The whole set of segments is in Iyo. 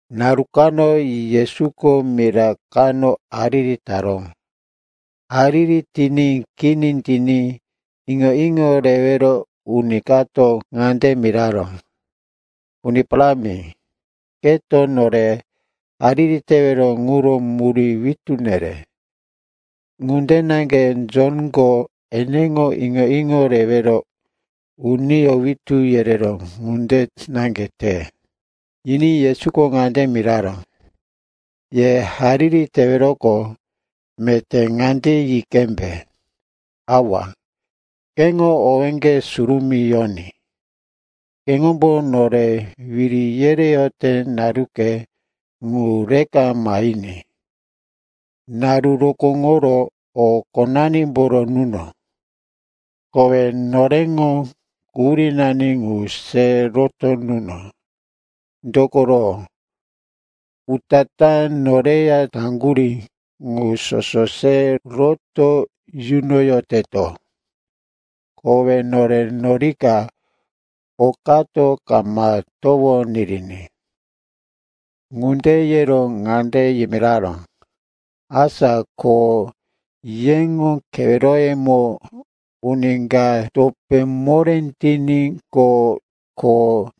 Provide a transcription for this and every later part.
Naru kano Yesuko mira kano hariri taró. Hariri tiní kini tiní, iŋo-iŋo rewero uni kato ŋande miraró, “Uni Parámi, keto nore hariri tewero ŋuro murí witú nere, ŋunde naŋge Jonko eneŋo iŋo-iŋo rewero uniyó witú yereró ŋunde naŋge te.” Yiní Yesuko ŋande yimiraró, “Ye hariri teweroqo, meté ŋande yi qembe, “‘Awa, keŋo owéŋge surumí yoní, keŋombo nore wiri yereyote naruke ŋu reka mahiní. Naru rokóŋoro o qonanimboro nuno. Kowe noreŋo quhurínani ŋu se roto nuno, dokoro, utatá noreya taŋgurí ŋu soso se roto yunoyoteto. Kowe nore norika okato kama towo niriní.’” Ŋunde yero ŋande yimiraró, “Asa ko yeŋo keweroyemo uni ka topé moré tiníqo, ko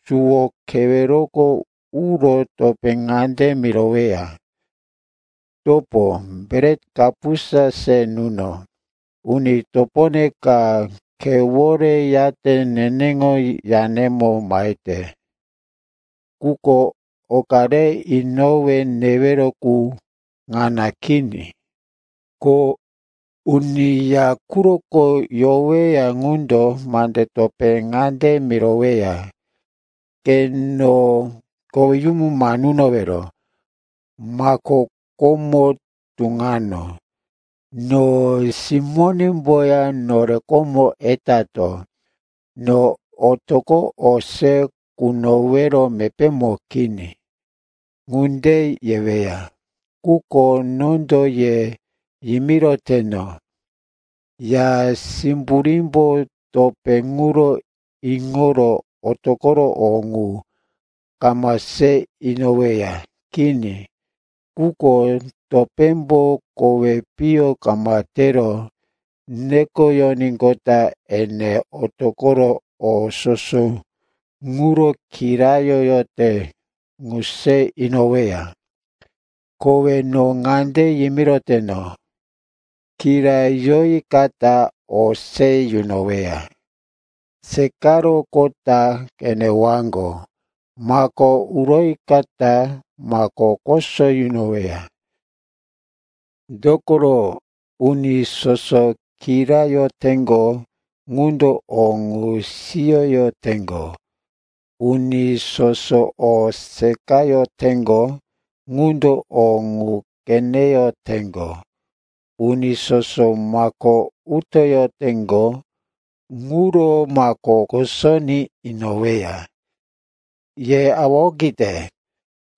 suwo keweroko uro topé ŋande miroweya, ‘Topo, bret kapusa se nuno. Uni topone ka khewore yate neneŋo yanemo mahete, quko oka re inowe newero qu ŋana kini.’ “Ko uni ya quroko yoweya ŋundo mande topé ŋande miroweya, ‘Ke no koweyumu ma nunowero. Mako komo tuŋano, no simónemboya nore komo etato. No otoqo o se kunowero mepémo kini.’ Ŋunde yeweya, quko nondo ye yimiroteno, ya simburímbo topé ŋuro iŋoro otoqoro o ŋu kama se inoweya. Kini. Quko topémbo kowi piyo kama tero nekoyoníqota, ene otoqoro o soso ŋuro kirayoyote ŋu se inoweya. “Kowe no ŋande yimiroteno, kirayoyikata o se yunoweya; seqaroqota qenewaŋgo; mako uroyikata mako koso yunoweya. Dokoro uni soso kirayoteŋgo ŋundo o ŋu siyoyoteŋgo; uni soso o seqayoteŋgo ŋundo o ŋu qeneyoteŋgo; uni soso mako utoyoteŋgo, ŋuro mako kosoní inoweya. “Ye awa okite,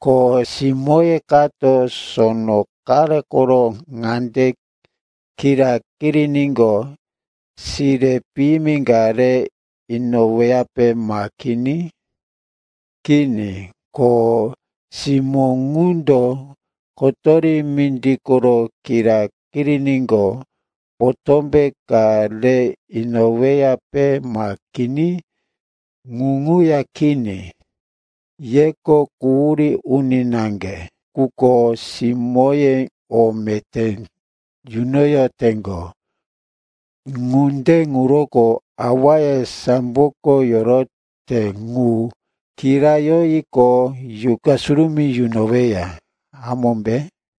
ko simóye kato sono qare koro ŋande kira kiriníqo sire piyimi ka re inoweyape, ma kini? Kini. Ko simó ŋundo kotori mindi koro kira kiriníqo potómbe ka re inoweyape, ma kini? Ŋu ŋuya kini. Yeko quhurí uni naŋge quko simóye o meté yunoyoteŋgo. Ŋunde ŋuroko awaye samboko yorote ŋu kirayoyiqo, Yuqa Surumí yunoweya, hamómbe?”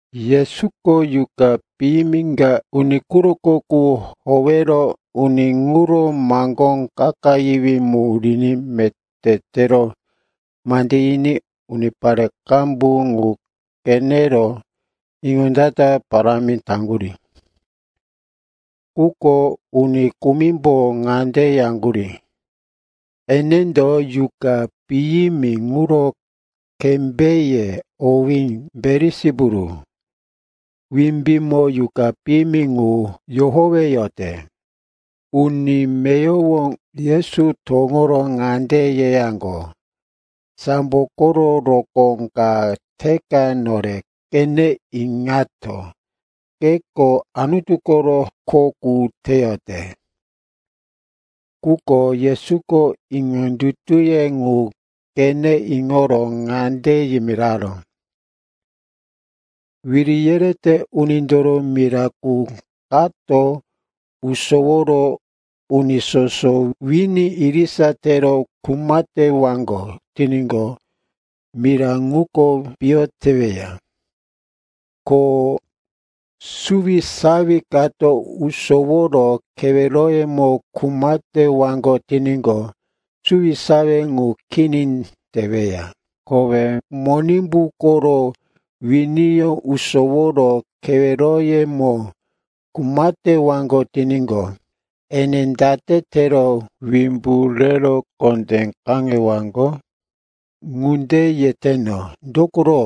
Yesuko yuqa piyimi ka uni quroko qu howero uni ŋuro maŋgó kakayiwí mu riní meté tero mande yiní unipare qambu ŋu qenero iŋondata parámi taŋgurí. Quko uni kumimbo ŋande yaŋgurí, enendo yuqa piyimi ŋuro kembéye, owí Belisipulu, wimbímo yuqa piyimi ŋu yohoweyote. Uni meyowo Yesu towoŋoro ŋande yeyaŋgo, “Sambo koro rokó ka teka nore qene iŋato, keko Anutu koro kho qu teyote.” Quko Yesuko iŋondutuye ŋu qene iŋoro ŋande yimiraró, “Wiri yerete unindoro mira qu kato usoworo uni soso wini irisa tero kuma tewaŋgo tiníqo, mira ŋuko piyo teweya. Ko suwisawi kato usoworo keweroyemo kuma tewaŋgo tiníqo, suwisawi ŋu kini teweya. Kowe Monimbu koro winiyó usoworo keweroyemo kuma tewaŋgo tiníqo, ene date tero wimbu rero kondé kaŋewaŋgo? Ŋunde yeteno, dokoro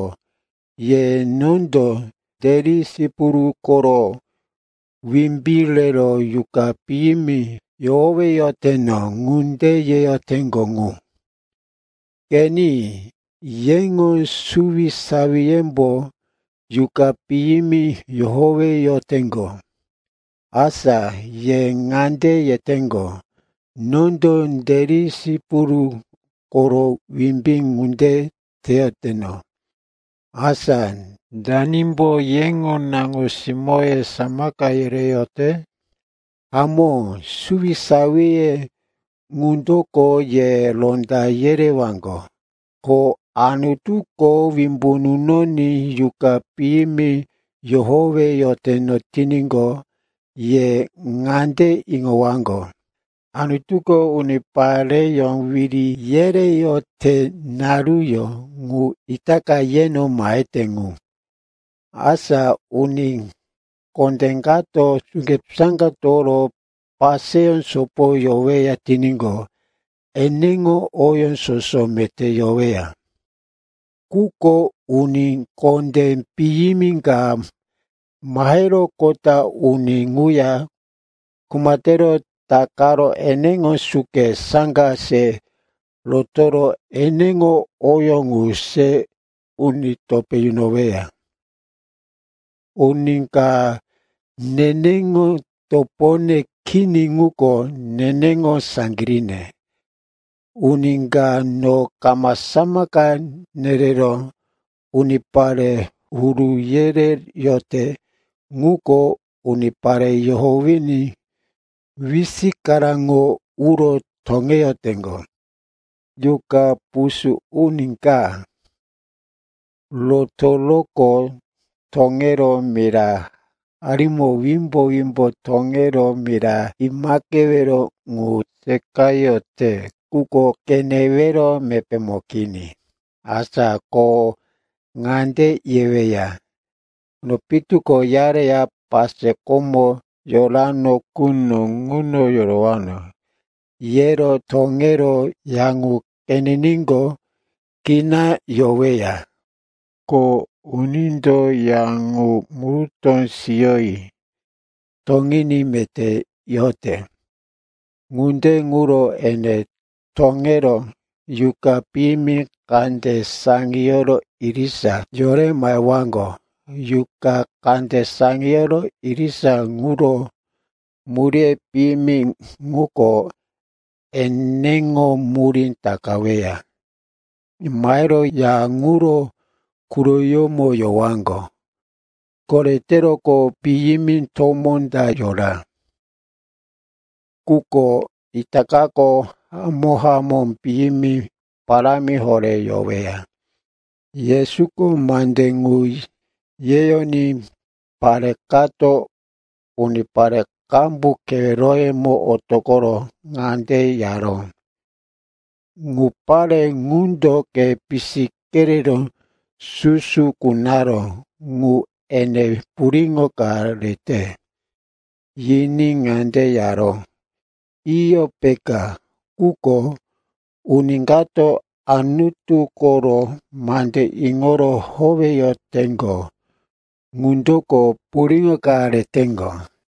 ye nondo Belisipulu koro wimbí rero yuqa piyimi yohoweyoteno ŋunde yeyoteŋgo ŋu. Qeni, yeŋo suwisawiyembo yuqa piyimi yohoweyoteŋgo. Asa ye ŋande yeteŋgo, nondo Belisipulu koro wimbí ŋunde teyoteno. Asa danimbo yeŋo naŋo-simóye samaka yereyote? Hamó, suwisawiye ŋundoko ye ronda yerewaŋgo. Ko Anutuko wimbu nunoní yuqa piyimi yohoweyoteno tiníqo, ye ŋande iŋowaŋgo, Anutuko unipareyó wiri yereyote naruyó ŋu itaka yeno mahete ŋu. “Asa uni kondé kato suke, saŋga toworo paseyó sopo yoweya tiníqo, eneŋo oyó soso meté yoweya. Quko uni kondé piyimi ka maheroqota uni ŋuya kuma tero takaro eneŋo suke, saŋga se rotoro eneŋo oyó ŋu se uni topé yunoweya. “Uni ka neneŋo topone kini ŋuko neneŋo saŋgiríne. Uni ka no kama samaka nerero unipare huru yereyote ŋuko unipare yohowiní wisikaraŋo uro toŋeyoteŋgo. “Yuqa pusú uni ka rotoroqo toŋero mira harimo wimbo-wimbo toŋero mira imaqewero ŋu seqayote, quko qenewero mepémo kini. Asa ko ŋande yeweya, ‘No pitu ko uyareya pase komo yorano quno ŋuno yorowano.’ Yero toŋero ya ŋu qeniníqo, kina yoweya, ko unindo ya ŋu murutó siyoyi toŋiní meté yote. Ŋunde ŋuro ene toŋero yuqa piyimi kande saŋiyoro irisa yore mahewaŋgo. Yuqa kande saŋiyoro irisa ŋuro muríye piyimi ŋuko eneŋo murí takaweya. Mahero ya ŋuro quroyómo yowaŋgo. Koreteroqo, piyimi tomó ta yora, quko itakako hamó-hamó piyimi parámi horé yoweya.” Yesuko mande ŋu yeyoní pare kato unipare qambu keweroyemo otoqoro ŋande yaró, “Ŋu pare ŋundo ke pisi kerero susu kunaró ŋu ene puriŋo ka rete.” Yiní ŋande yaró, “Iyo, peka. Quko uni kato Anutu koro mande iŋoro howeyoteŋgo ŋundoko puriŋo ka reteŋgo.”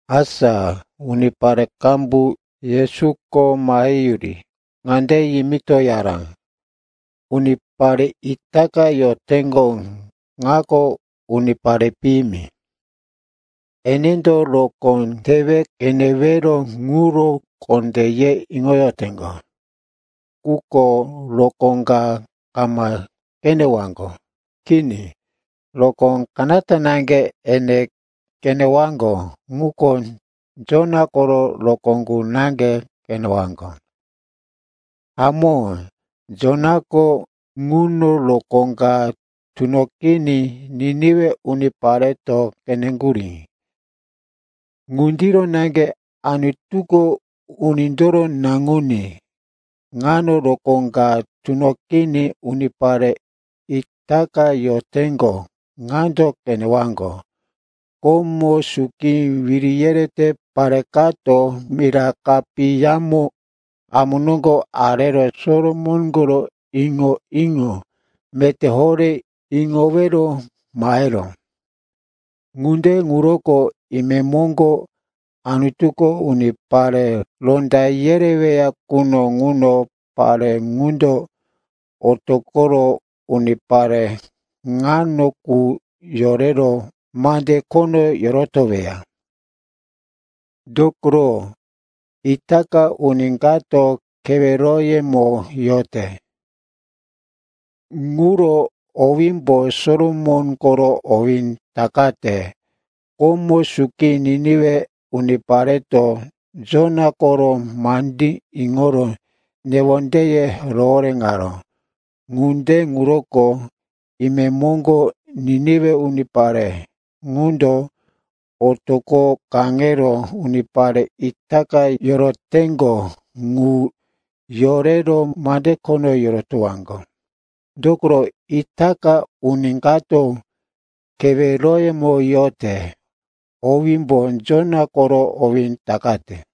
Asa unipare qambu Yesuko maheyuri ŋande yimitoyaró, “Unipare itaka yoteŋgo ŋako unipare piyimi. Enendo rokó tewe qenewero ŋuro kondé ye iŋoyoteŋgo. Quko rokó ka kama qenewaŋgo. Kini, rokó kanata naŋge ene qenewaŋgo, ŋuko Jona koro rokó qu naŋge qenewaŋgo. Hamó, Jonako ŋuno rokó ka tunoqiní Niniwe unipareto qeneŋgurí. Ŋundiro naŋge Anutuko Unindoro Naŋuní ŋano rokó ka tunoqiní unipare itaka yoteŋgo ŋando qenewaŋgo. Komo suki wiri yerete pare kato mira kapiyamo amu noŋgo arero Solomon koro iŋo-iŋo meté horé iŋowero maheró. Ŋunde ŋuroko imemoŋgo Anutuko unipare ronda yereweya quno ŋuno pare ŋundo otoqoro unipare ŋano qu yorero mande khono yorotoweya. Dokoro itaka uni kato keweroyemo yote, ŋuro owímbo Solomon koro owí takate. Komo suki Niniwe unipareto Jona koro mandí iŋoro newondeye rohoréŋaró. Ŋunde ŋuroko imemoŋgo Niniwe unipare ŋundo otoqo kaŋero unipare itaka yoroteŋgo ŋu yorero mande khono yorotowaŋgo. Dokoro itaka uni kato keweroyemo yote, owímbo Jona koro owí takate.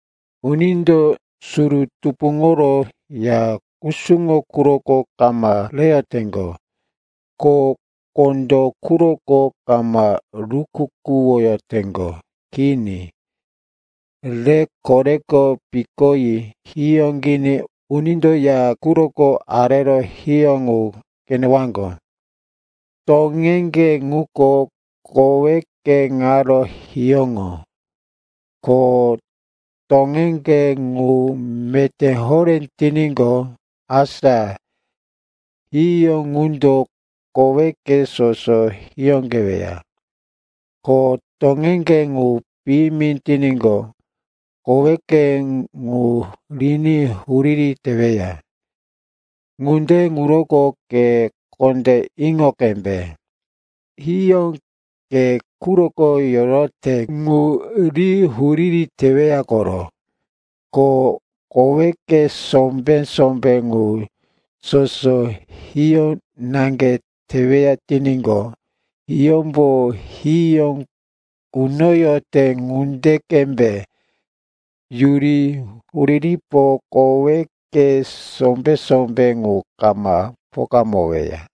“Unindo suru tupuŋoro ya kusuŋo quroko kama reyoteŋgo, ko kondó quroko kama rukukuwoyoteŋgo. Kini, rero koreko pikoyi hiyóqiní unindo ya quroko arero hiyó ŋu qenewaŋgo. Toŋeŋge ŋuko koweke ŋaro hiyóŋo. Ko toŋeŋge ŋu meté horé tiníqo, asa hiyó ŋundo koweke soso hiyóqeweya. Ko toŋeŋge ŋu piyimi tiníqo, koweke ŋu riní huriri teweya. Ŋunde ŋuroko ke kondé iŋo qembe, hiyó ke quroko yorote ŋu ri huriri teweya koro. Ko koweke sombé-sombé ŋu soso hiyó naŋge teweya tiníqo, hiyómbo hiyó kunoyote ŋunde qembe yuri huriripo koweke sombé-sombé ŋu kama pokamoweya.”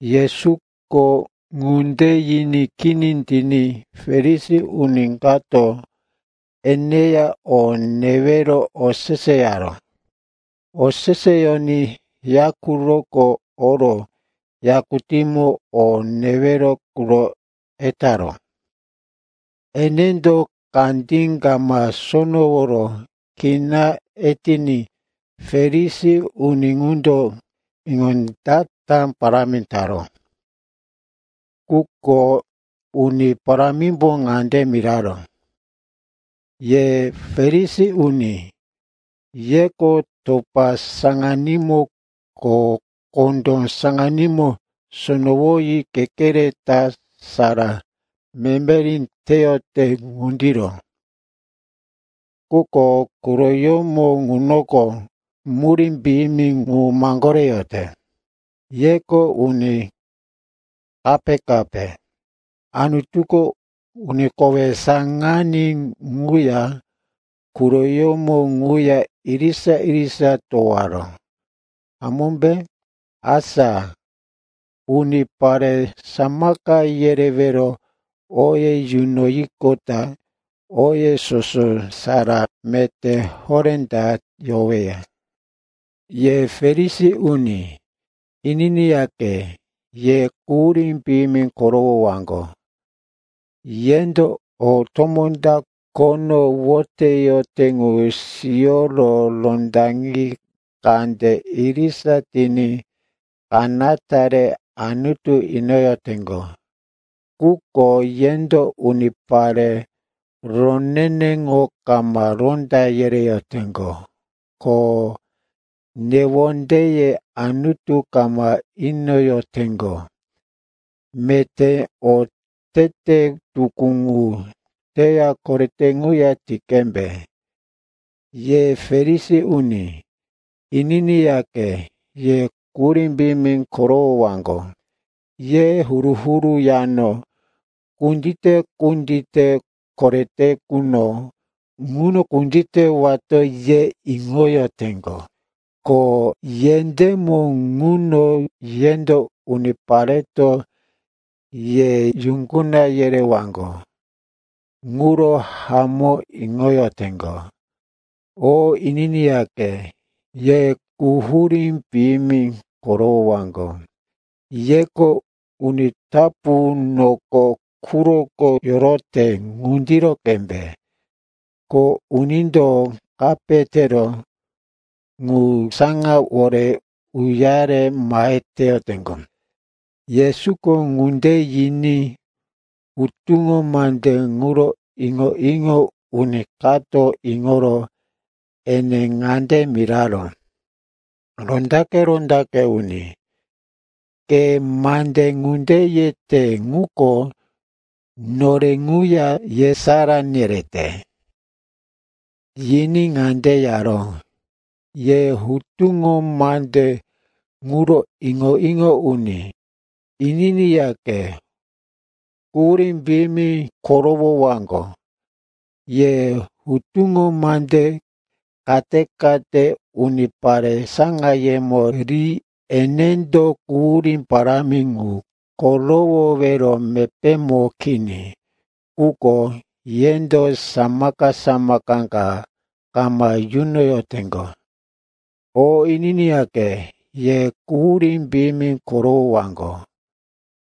Yesuko ŋunde yiní kini tiní Farisi uni kato eneya o newero oseseyaró. Oseseyoní ya quroko oro yakutímo o newero quro etaró. Enendo kandí kama sonoworo kina etiní Farisi uni ŋundo iŋondata parámi taró. Quko Uni Parámimbo ŋande miraró, “Ye Farisi uni, yeko topa saŋanímo ko kondó saŋanímo sonowoyi kekere ta sara memeri teyote ŋundiro. Quko quroyómo ŋunoko murí piyimi ŋu maŋgoreyote. Yeko uni kape-kape. Anutuko uni kowe saŋaní ŋuya quroyómo ŋuya irisa-irisa towaró, hamómbe? Asa unipare samaka yerewero oye yunoyiqota oye soso sara meté horé ta yoweya. “Ye Farisi uni, ininiyaqe, ye quhurí piyimi korowowaŋgo. Yendo o tomó ta khono woteyote ŋu siyoro rondaŋi kande irisa tiní kanata rero Anutu inoyoteŋgo. Quko yendo unipare roneneŋo kama ronda yereyoteŋgo, ko newondeye Anutu kama inoyoteŋgo. Meté otete tukú ŋu teya korete ŋuya ti qembe. “Ye Farisi uni, ininiyaqe, ye quhurí piyimi korowowaŋgo. Ye huru-huru yano kundite-kundite korete quno ŋuno kunditewato, ye iŋoyoteŋgo, ko yendémo ŋuno yendo, unipareto ye yuŋguna yerewaŋgo, ŋuro hamó iŋoyoteŋgo. “O ininiyaqe, ye quhurí piyimi korowowaŋgo. Yeko uni tapu noko quroko yorote ŋunde qembe. Ko unindo kape tero ŋu saŋawore uyare mahe teyoteŋgo.” Yesuko ŋunde yiní hutuŋo mande ŋuro iŋo-iŋo uni kato iŋoro ene ŋande miraró, “Rondaqe-rondaqe uni, ke mande ŋunde yete ŋuko nore ŋuya yesará nerete.” Yiní ŋande yaró, “Ye hutuŋo mande ŋuro iŋo-iŋo uni, ininiyaqe, quhurí piyimi korowowaŋgo. Ye hutuŋo mande kate-kate unipare saŋayemo ri enendo quhurí parámi ŋu korowowero mepémo kini. Quko yendo samaka-samaka ka kama yunoyoteŋgo. “O ininiyaqe, ye quhurí piyimi korowowaŋgo.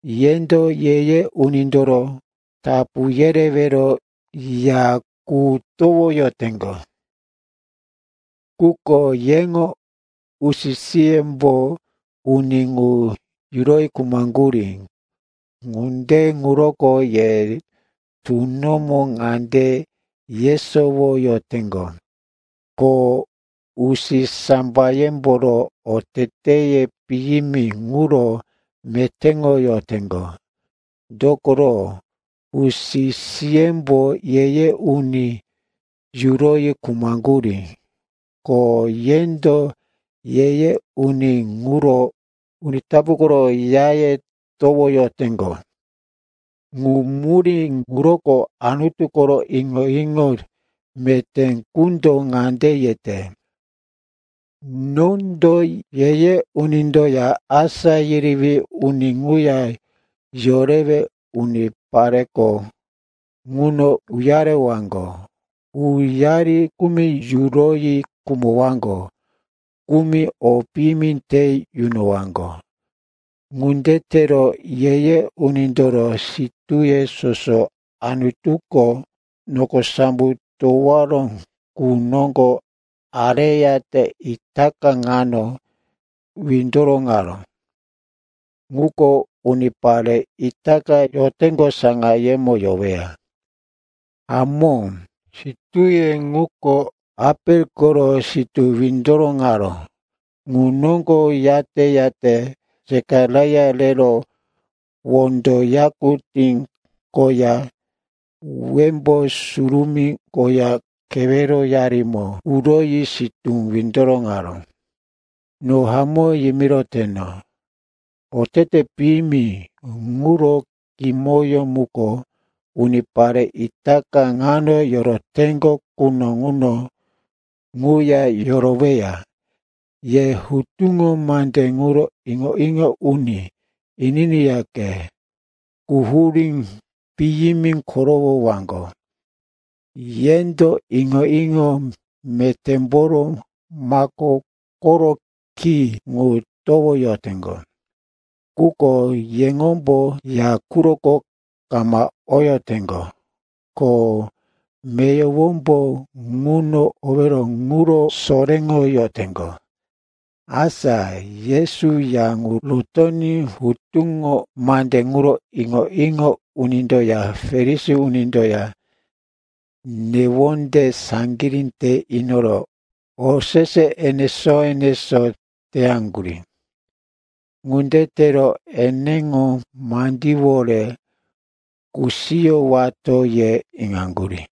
Yendo ye-ye unindoro tapu yerewero ya qu towoyoteŋgo, quko yeŋo usi-siyembo uni ŋu yuroyi khumaŋgurí. Ŋunde ŋuroko ye tunomo ŋande yesowoyoteŋgo, ko usisambayemboro oteteye piyimi ŋuro metéŋoyoteŋgo. Dokoro usi-siyembo ye-ye uni yuroyi khumaŋgurí, ko yendo ye-ye uni ŋuro uni tapu koro yaye towoyoteŋgo. Ŋu murí ŋuroko Anutu koro iŋo-iŋo meté qundo ŋande yete, ‘Nondo ye-ye unindoya asá yerewí uni ŋuya yorewe unipareko ŋuno uyarewaŋgo. Uyari kumi yuroyi khumowaŋgo, kumi o piyimi te yunowaŋgo.’ Ŋunde tero ye-ye unindoro sitúye soso Anutuko noko sambo towaró qu noŋgo areyate itaka ŋano windoroŋaró ŋuko unipare itaka yoteŋgo saŋayemo yoweya. Hamó, sitúye ŋuko Apel koro sitú windoroŋaró ŋu noŋgo yate-yate Sekaraia rero wondo yakutí koya Wembó Surumí koya keweroyarimo uroyi sitú windoroŋaró. No hamó yimiroteno, otete piyimi ŋuro kimoyó muko unipare itaka ŋano yoroteŋgo quno ŋuno ŋuya yoroweya. “Ye hutuŋo mande ŋuro iŋo-iŋo uni, ininiyaqe, quhurí piyimi korowowaŋgo. Yendo iŋo-iŋo metémboro mako koro ki ŋu towoyoteŋgo. Quko yeŋombo ya quroko kama oyoteŋgo, ko meyowombo ŋuno owero ŋuro soréŋoyoteŋgo.” Asa Yesu ya ŋu rotoní hutuŋo mande ŋuro iŋo-iŋo unindoya Farisi unindoya newonde saŋgirí te inoro osese enesó-enesó teyaŋgurí. Ŋunde tero, eneŋo mandíwore kusiyowato, ye iŋaŋgurí.